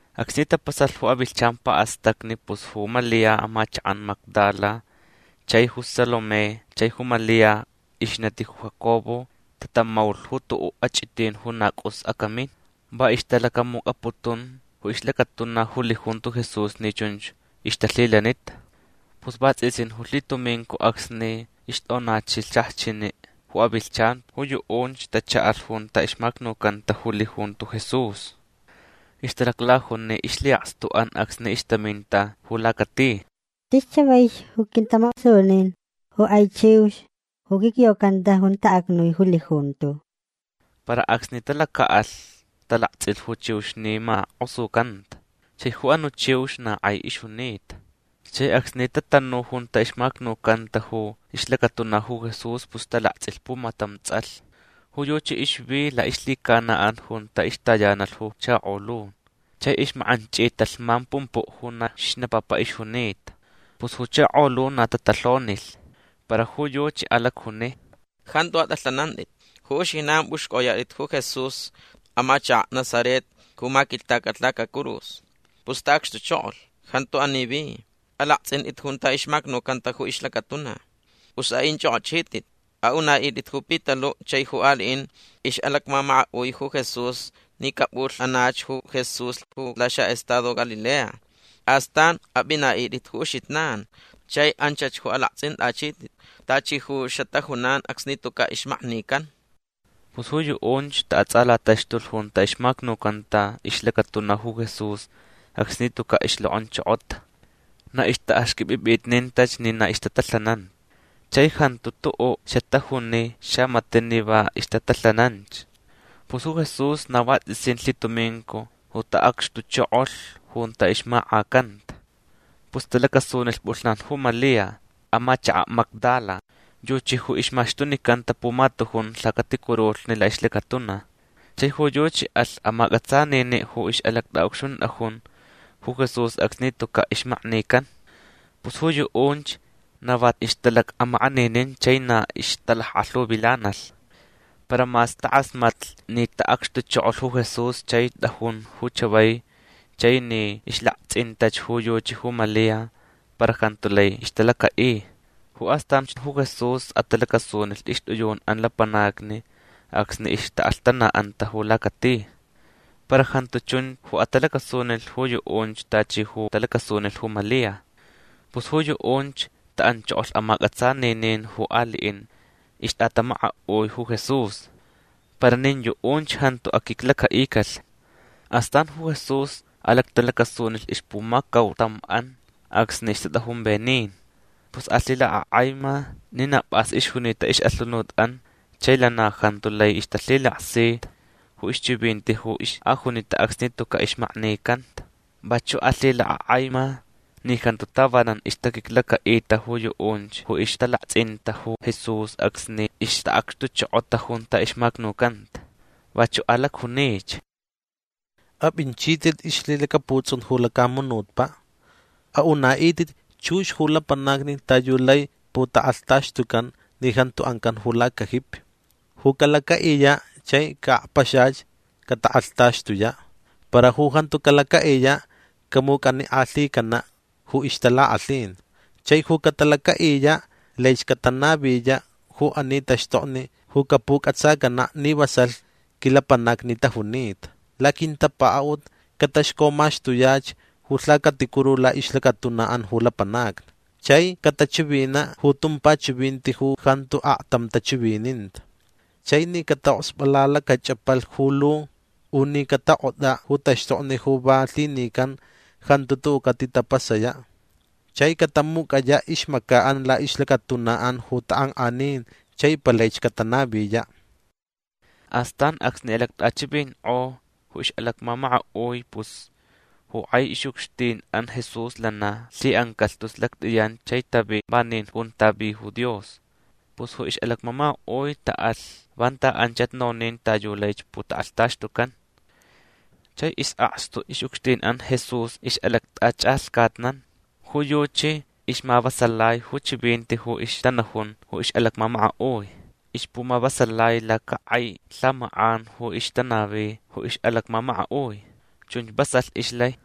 Acsni tapasalh ju avilhchan pa'astacni pus ju Malia amachaka' Magdala chai ju Salomé chai ju Malia ixnati ju Jacobo tatamaulh ju tu'u' ach'itin ju na c'us acamin. Va ixtalacamuc'aputun ju ixlacatuna ju lijunto Jesús ni chunch ixtalhilanita. Pus vats'isin ju lhitumincu acsni ixt'onachilh xajchini' ju avilhchan ju yu'unch tacha'alh junta ixmacnucanta ju lijunto Jesús. Ixtalaclajuni ixlhi'akstu'an acsni ixtaminta ju lacati: ―Tis chavaich ju aquintamak'osunin ju k'ai chiux ju quicyocanta junta acnui ju lijunto. Para acsni talaca'alh talakts'ilh ju chiux ni mak'osucanta. Chai ju anu' chiux na k'ai ixjunita. Chai acsni tatanu junta ixmacnucanta ju ixlacatuna ju Jesús pus talakts'ilh pumatam ts'alh. Ju yuchi ixvi la'ixlhicana'an junta ixtayanalh ju chakolun. Chai ixmak'anch'ita lhman pumpu' ju na xnapapa ixjunita. Pus ju chakolun na tatalhonilh. Para ju yuchi alacjuni: ―Jantu at'alhanant'it. Ju uxijnan p'uxc'oyat'it ju Jesús amachaka' Nazaret ju maquilhtacalh lacacurus. Pus ta'acxtuchokolh. Jantu ani vi. Alakts'int'it junta ixmamacanta ju ixlacatuna. Pus a'inch'ok'ochit'it. A'una'it'it ju Pitalu' chai ju ali'in ix'alacmamaka'ui ju Jesús ni cap'ulh'anach ju Jesús ju laxa'estado Galilea. Astan ap'ina'it'it ju uxijnan chai anchach ju alakts'int'achit'it tachi ju xatajunan acsni tuca' ixmaknican. Pus ju yu'unch ta'ats'alataxtulh junta ixmacnucanta ixlacatuna ju Jesús acsni tuca' ixlok'onchokota. Na ixta'axq'uip'ip'itnintach ni na ixtatalhanan. Chai jantu tu'u' xatajuni xamati' ni va ixtatalhananch. Pus ju Jesús na vats'isin lhitumincu ju ta'acxtuchokolh junta ixmak'acanta. Pus talacasunilh p'ulhnan ju Malia amachaka' Magdala. Yuchi ju ixmaxtunicanta pumatujun lhacaticurulhni la'ixlacatuna. Chai ju yuchi alh amac'atsanini' ju ix'alact'a'ucxunt'ajun ju Jesús acsni tuca' ixmaknican. Pus ju yu'unch na va ixtalac'amak'aninin chai na ixtalack'alhuvilanalh. Para mas tak'asmatlh ni ta'acxtuchokolh ju Jesús chai t'ajun ju chavai chai ni ixlakts'intach ju yuchi ju Malia para jantu lai ixtalaca'i. Ju astanch ju Jesús atalacasunilh ixt'iyun'an lapanacni acsni ixta'alhtana'anta ju lacati. Para jantu chun ju atalacasunilh ju yu'unch tachi ju talacasunilh ju Malia. Pus ju yu'unch ta'anchokolh amac'atsaninin ju ali'in ixt'atamaka'ui ju Jesús. Para nin yu'unch jantu aquiclaca'icalh. Astan ju Jesús alactalacasunilh ixpumacautam'an acsni ixtat'ajun venin. Pus alhilak'ak'aima ni na p'as ixjunita ix'alhunut'an chai lana jantu lai ixtalhilaksita ju ixchivinti ju ix'ajunita acsni tuca' ixmaknicanta. Vachu' alhilak'ak'aima ni jantu tavanan ixtaquiclaca'ita ju yu'unch ju ixtalakts'inta ju Jesús acsni ixta'acxtuchokota junta ixmacnucanta. Vachu' alacjunich: ―Ap'inchit'it ixlhilacaputs'un ju lacamunutpa'. A'una'it'it chux ju lapanacni ta yu lai putak'alhtaxtucan ni jantu ancan ju lacajipi. Ju calaca'iya' chai ca'akpaxach catak'alhtaxtuya'. Para ju jantu calaca'iya' camuc'anik'alhicana' ju ixtalak'alhin. Chai ju catalaca'iya' laich catanaviya' ju ani taxtokni ju capuc'atsacana' ni vasalh quilapanacni tajunita. Laquintapaka'ut cataxcomaxtuyach ju lhacaticuru la'ixlacatuna'an ju lapanacni. Chai catachivina' ju tumpa chivinti ju jantu aktam tachivininta. Chai ni cata'oksp'alalacach'apalh ju lu u ni catak'ot'a' ju taxtokni ju va lhinican jantu tu'u' catitapasaya'. Chai catamuc'aya' ixmaca'an la'ixlacatuna'an ju tak'ank'anin chai palaich catanaviya'. Astan acsni alact'achivink'o ju ix'alacmamaka'ui pus ju k'ai ix'ucxtin'an Jesús lana lhi'ancalh tus lact'iyan chai tavi vanin junta vi ju Dios. Pus ju ix'alacmamaka'ui ta'alh vanta anchach nonin ta yu laich putak'alhtaxtucan. Chai is'akstu ix'ucxtin'an Jesús ix'alact'ach'alhcatnan. Ju yuchi ixmavasalai ju chivinti ju ixtanajun ju ix'alacmamaka'ui. Ixpumavasalai lacak'ai lhamak'an ju ixtanavi ju ix'alacmamaka'ui. Chunch vasalh ixlai.